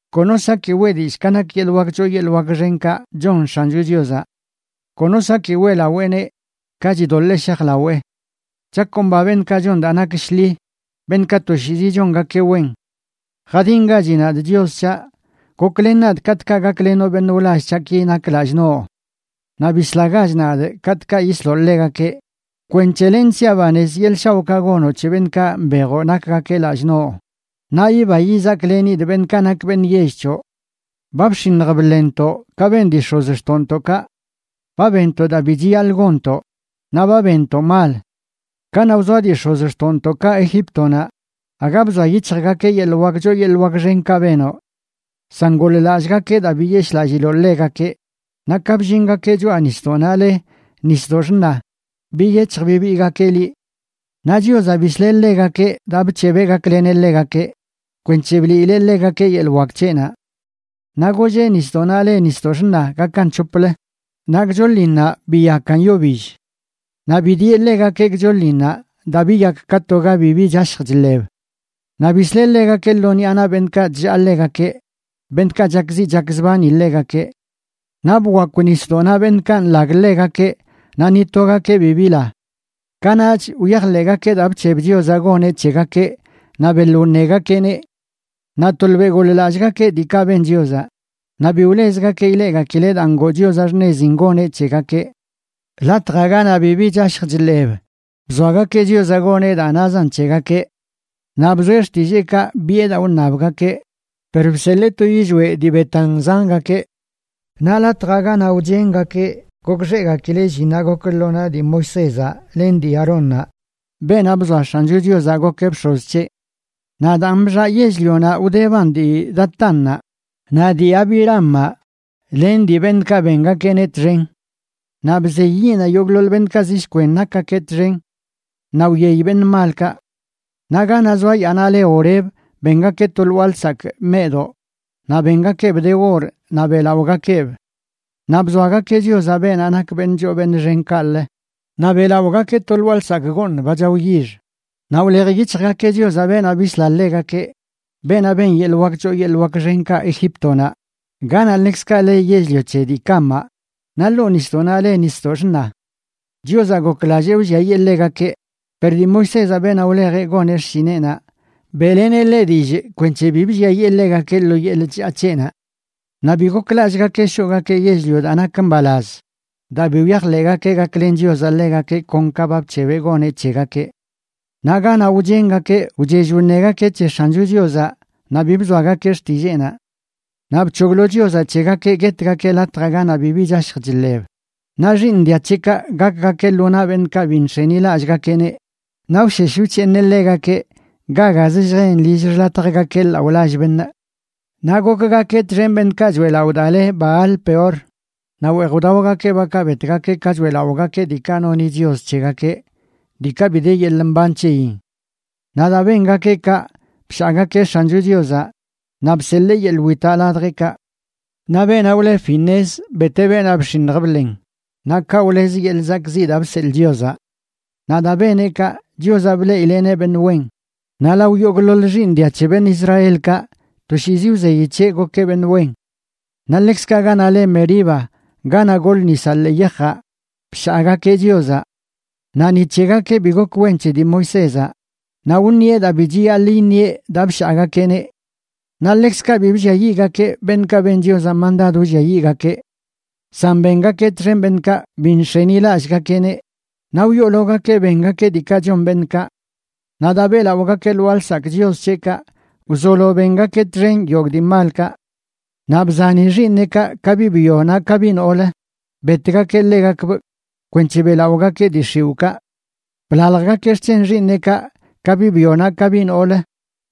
Kono saki weꞌ dillꞌ ka nak yeḻꞌ wak choo yeḻꞌ wak xenkaꞌ chon X̱ancho Chiozaꞌ. Kono saki weꞌlaweeneꞌ ka chidoḻee shajlawee. Chakomba beṉꞌkaꞌ chon daa nak shḻi, beṉꞌkaꞌ toshiizi chongakeꞌ wen. Jadingachi nadꞌ, Chios c̱haꞌ, goklen nadꞌ katꞌkaꞌ gaklenoꞌ beṉꞌ wlall c̱haꞌki nak lallꞌ noꞌ; naꞌ bislagach nadꞌ katꞌkaꞌ yisloꞌ ḻegakeꞌ, kwenc̱he lenꞌ siaꞌ banez yeḻꞌ shaoꞌkaꞌ gonoꞌ c̱he beṉꞌkaꞌ mbejoꞌ nakgakeꞌ lallꞌ noꞌ, naꞌ yiba yizaklenidꞌ beṉꞌkaꞌ nak beṉꞌ yell c̱hoꞌ. Ba bx̱iṉj bḻenntoꞌ, ka ben dii x̱ozxtoꞌntoꞌkaꞌ. Ba benntoꞌ daa bi chiyaḻꞌ gonntoꞌ, naꞌ ba benntoꞌ mal. Kanaꞌ wzoa dii x̱ozxtoꞌntoꞌkaꞌ Egíptonaꞌ, aga bzoa yic̱hjgakeꞌ yeḻꞌ wak choo yeḻꞌ wak xenkaꞌ benoꞌ; san goḻ-lallꞌgakeꞌ daa biyeshꞌlalliloꞌ ḻegakeꞌ, naꞌ ka bllingakeꞌ choꞌa nisdoꞌnaꞌ le Nisdoꞌ Xṉa, biyec̱hj bibiigakeꞌ liꞌ. Naꞌ Chiozaꞌ bisleꞌ ḻegakeꞌ daa bc̱hebeꞌ gakleneꞌ ḻegakeꞌ, kwenc̱he bliileꞌ ḻegakeꞌ yeḻꞌ wak c̱heꞌnaꞌ. Naꞌ golleꞌ nisdoꞌnaꞌ le Nisdoꞌ Xṉa gakan c̱hoplə, naꞌ gchoḻinnaꞌ biyakan yo bill. Naꞌ bidieꞌ ḻegakeꞌ gchoḻinnaꞌ daa biyak ka to ga bibi chashj chḻeb. Naꞌ bisleꞌ ḻegakeꞌ lo ṉiꞌa naꞌ beṉꞌkaꞌ chllaa ḻegakeꞌ, beṉꞌkaꞌ chakziꞌ chakzbani ḻegakeꞌ. Naꞌ bkwakw nisdoꞌnaꞌ beṉꞌkaꞌ nḻag ḻegakeꞌ, naꞌ ni togakeꞌ bi bila. Kanaꞌch wyajḻeꞌgakeꞌ daa bc̱heb Chiozaꞌ goneꞌ c̱hegakeꞌ, naꞌ beḻ wṉegakeꞌneꞌ. Naꞌ tolbeꞌ goḻ-lallꞌgakeꞌ diikaꞌ ben Chiozaꞌ, naꞌ bi wlezgakeꞌ ileꞌgakileꞌ daa ngoo Chiozaꞌ xṉezin goneꞌ c̱hegakeꞌ. Latjaꞌ ganaꞌ bibi chashj chḻeb bzoagakeꞌ Chiozaꞌ goneꞌ daa nazan c̱hegakeꞌ. Naꞌ bzoeꞌ xtilleekaꞌ, biꞌe daa wṉabgakeꞌ, per bseḻee to yillweꞌ dii betan zangakeꞌ. Naꞌ latjaꞌ ganaꞌ wchengakeꞌ gokxeꞌgakileꞌ llinnaꞌ gok lo naꞌ dii Moisézaꞌ len dii Aarónnaꞌ, beenaꞌ bzoa X̱ancho Chiozaꞌ gokeꞌ bx̱oz c̱heꞌ. Naꞌ daan bxaꞌ yell-lionaꞌ wdeban dii Datánnaꞌ, naꞌ dii Abiramaꞌ len dii beṉꞌkaꞌ bengakeꞌneꞌ txen. Naꞌ bzey yiꞌnaꞌ yogꞌḻoḻ beṉꞌkaꞌ zi shkwen nakgakeꞌ txen. Naꞌ wyey beṉꞌ malkaꞌ. Naꞌ ganaꞌ zoa yaanaꞌ le Horeb bengakeꞌ to lwaa lsakꞌ meꞌdoꞌ, naꞌ bengakeꞌb de or naꞌ beꞌlaꞌogakeꞌb. Naꞌ bzoagakeꞌ Chiozaꞌ, beenaꞌ nak beṉꞌ choo beṉꞌ xen, kaꞌlə naꞌ beꞌlaꞌogakeꞌ to lwaa lsakꞌ gooṉ, ba chao yix. Naꞌ wlej yic̱hjgakeꞌ Chiozaꞌ, beenaꞌ bisla ḻegakeꞌ, beenaꞌ ben yeḻꞌ wak choo yeḻꞌ wak xenkaꞌ Egíptonaꞌ, ganaꞌ ḻekzkaꞌ le yell-lio c̱he dii Camaꞌ, naꞌ ḻoo nisdoꞌnaꞌ le Nisdoꞌ Xṉa. Chiozaꞌ goklallee wlliayee ḻegakeꞌ, per dii Moisézaꞌ, beenaꞌ wlejeꞌ goneꞌ xshineꞌnaꞌ, beꞌleneꞌ ḻeꞌ dillꞌ kwenc̱he bi blliayee ḻegakeꞌ lo yeḻꞌ chllaa c̱heꞌnaꞌ. Naꞌ bi goklallꞌgakeꞌ shoꞌgakeꞌ yell-lio daa nak mbalaz, daa bi wyajḻeꞌgakeꞌ gaklen Chiozaꞌ ḻegakeꞌ kon ka ba bc̱hebeꞌ goneꞌ c̱hegakeꞌ. Naꞌ ganaꞌ wchengakeꞌ wchell wṉegakeꞌ c̱he X̱ancho Chiozaꞌ, naꞌ bi bzoagakeꞌ xtilleenaꞌ. Naꞌ bc̱hoglo Chiozaꞌ c̱hegakeꞌ guetgakeꞌ latjaꞌ ganaꞌ bibi chashj chḻeb, naꞌ xiiṉ dia c̱heꞌkaꞌ gakgakeꞌ lo naꞌ beṉꞌkaꞌ bi nx̱enilallꞌgakeꞌneꞌ, naꞌ wshesh wc̱heeṉeꞌ ḻegakeꞌ ga gazə lljen lill xḻatjgakeꞌ laꞌo lall beṉꞌ. Naꞌ gokgakeꞌ txen beṉꞌkaꞌ choeꞌlaꞌo daa le Baal-peor, naꞌ weej wdaogakeꞌ bakaꞌ betgakeꞌ ka choeꞌlaꞌogakeꞌ diikaꞌ noni chios c̱hegakeꞌ, diikaꞌ bi de yeḻꞌ mban c̱heyin. Naꞌ daa bengakeꞌ kaꞌ, bshaagakeꞌ X̱ancho Chiozaꞌ, naꞌ bseḻee yeḻꞌ witaꞌ ladjeꞌkaꞌ. Naꞌ beenaꞌ wle Finees, beteꞌ beenaꞌ bx̱iṉj bḻen, naꞌ kaꞌ, wlez yeḻꞌ zakꞌziꞌ daa bseḻꞌ Chiozaꞌ. Naꞌ daa beneꞌ kaꞌ, Chiozaꞌ bleꞌileꞌneꞌ beṉꞌ wen, naꞌ lao yogꞌḻoḻ xiiṉ dia c̱he beṉꞌ Israelkaꞌ toshiizi wzeyi c̱heꞌ gokeꞌ beṉꞌ wen. Naꞌ ḻekzkaꞌ ganaꞌ le Meriba, ganaꞌ gol nisaꞌ ḻee yajaꞌ, bshaagakeꞌ Chiozaꞌ. Naꞌ ni c̱hegakeꞌ bi gok wen c̱he dii Moisézaꞌ, naꞌ wṉieꞌ daa bi chiyaḻꞌ iṉieꞌ daa bshaagakeꞌneꞌ. Naꞌ ḻekzkaꞌ bi blliayiꞌgakeꞌ beṉꞌkaꞌ ben Chiozaꞌ mandad wlliayiꞌgakeꞌ; san bengakeꞌ txen beṉꞌkaꞌ bi nx̱enilallꞌgakeꞌneꞌ, naꞌ wyoologakeꞌ bengakeꞌ diikaꞌ chon beṉꞌkaꞌ. Naꞌ daa beꞌlaꞌogakeꞌ lwaa lsakꞌ chios c̱heꞌkaꞌ, wzolo bengakeꞌ txen yogꞌ dii malkaꞌ. Naꞌ bzani xiiṉeꞌkaꞌ, ka biꞌ byo naꞌ ka biꞌ noolə, betgakeꞌ ḻegakbꞌ kwenc̱he beꞌlaꞌogakeꞌ dii x̱iwꞌkaꞌ. Blaljgakeꞌ xc̱hen xiiṉeꞌkaꞌ, ka biꞌ byo naꞌ ka biꞌ noolə,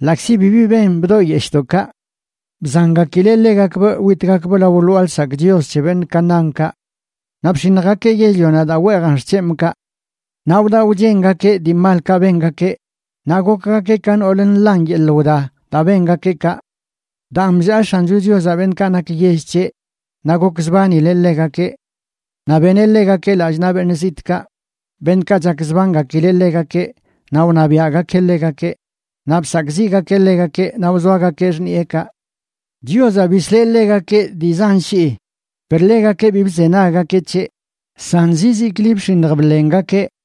ḻaꞌkzi bibi ben bdoꞌyeshꞌdoꞌkaꞌ. Bzangakileꞌ ḻegakbꞌ witgakbꞌ lao lwaa lsakꞌ chios c̱he beṉꞌ Canaánkaꞌ; naꞌ bx̱iṉjgakeꞌ yell-lionaꞌ daa weejan xc̱hemꞌkaꞌ. Naꞌ wdaꞌ wchengakeꞌ dii malkaꞌ bengakeꞌ, naꞌ gokgakeꞌ ka nool nḻan yeḻꞌ wda daa bengakeꞌ kaꞌ. Daan, bllaa X̱ancho Chiozaꞌ beṉꞌkaꞌ nak yell c̱heꞌ, naꞌ gokzbanileꞌ ḻegakeꞌ. Naꞌ beneꞌ ḻegakeꞌ lallꞌ naꞌ beṉꞌ zitꞌkaꞌ, beṉꞌkaꞌ chakzbangakileꞌ ḻegakeꞌ, naꞌ wṉabiaꞌgakeꞌ ḻegakeꞌ, naꞌ bsakꞌziꞌgakeꞌ ḻegakeꞌ, naꞌ wzoagakeꞌ xṉiꞌekaꞌ. Chiozaꞌ bisleꞌ ḻegakeꞌ dii zan shii, per ḻegakeꞌ bi bzenaggakeꞌ c̱heꞌ, san zizikli bx̱iṉj bḻengakeꞌ.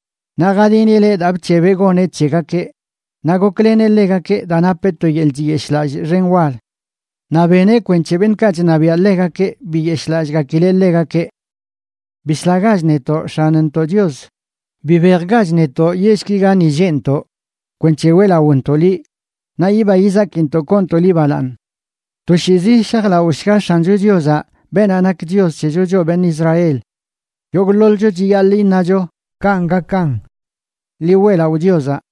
Naꞌ jadinileꞌ daa bc̱hebeꞌ goneꞌ c̱hegakeꞌ, naꞌ gokleneꞌ ḻegakeꞌ daa napeꞌ to yeḻꞌ chiyeshꞌlallꞌ xen wal. Naꞌ beneꞌ kwenc̱he beṉꞌkaꞌ chṉabiaꞌ ḻegakeꞌ biyeshꞌlallꞌgakileꞌ ḻegakeꞌ. Bislagach netoꞌ, X̱anntoꞌ Chios. Bibejgach netoꞌ yellki gani lleꞌntoꞌ, kwenc̱he weꞌlaꞌontoꞌ liꞌ, naꞌ yiba yizakintoꞌ koontoꞌ liꞌ balaaṉ. Toshiizi shajlaꞌoshga X̱ancho Chiozaꞌ, beenaꞌ nak Chios c̱hecho choꞌ beṉꞌ Israel. Yogꞌḻoḻcho chiyaḻꞌ iṉacho: “Kanꞌ gakan.” ¡Ḻi weꞌlaꞌo Chiozaꞌ!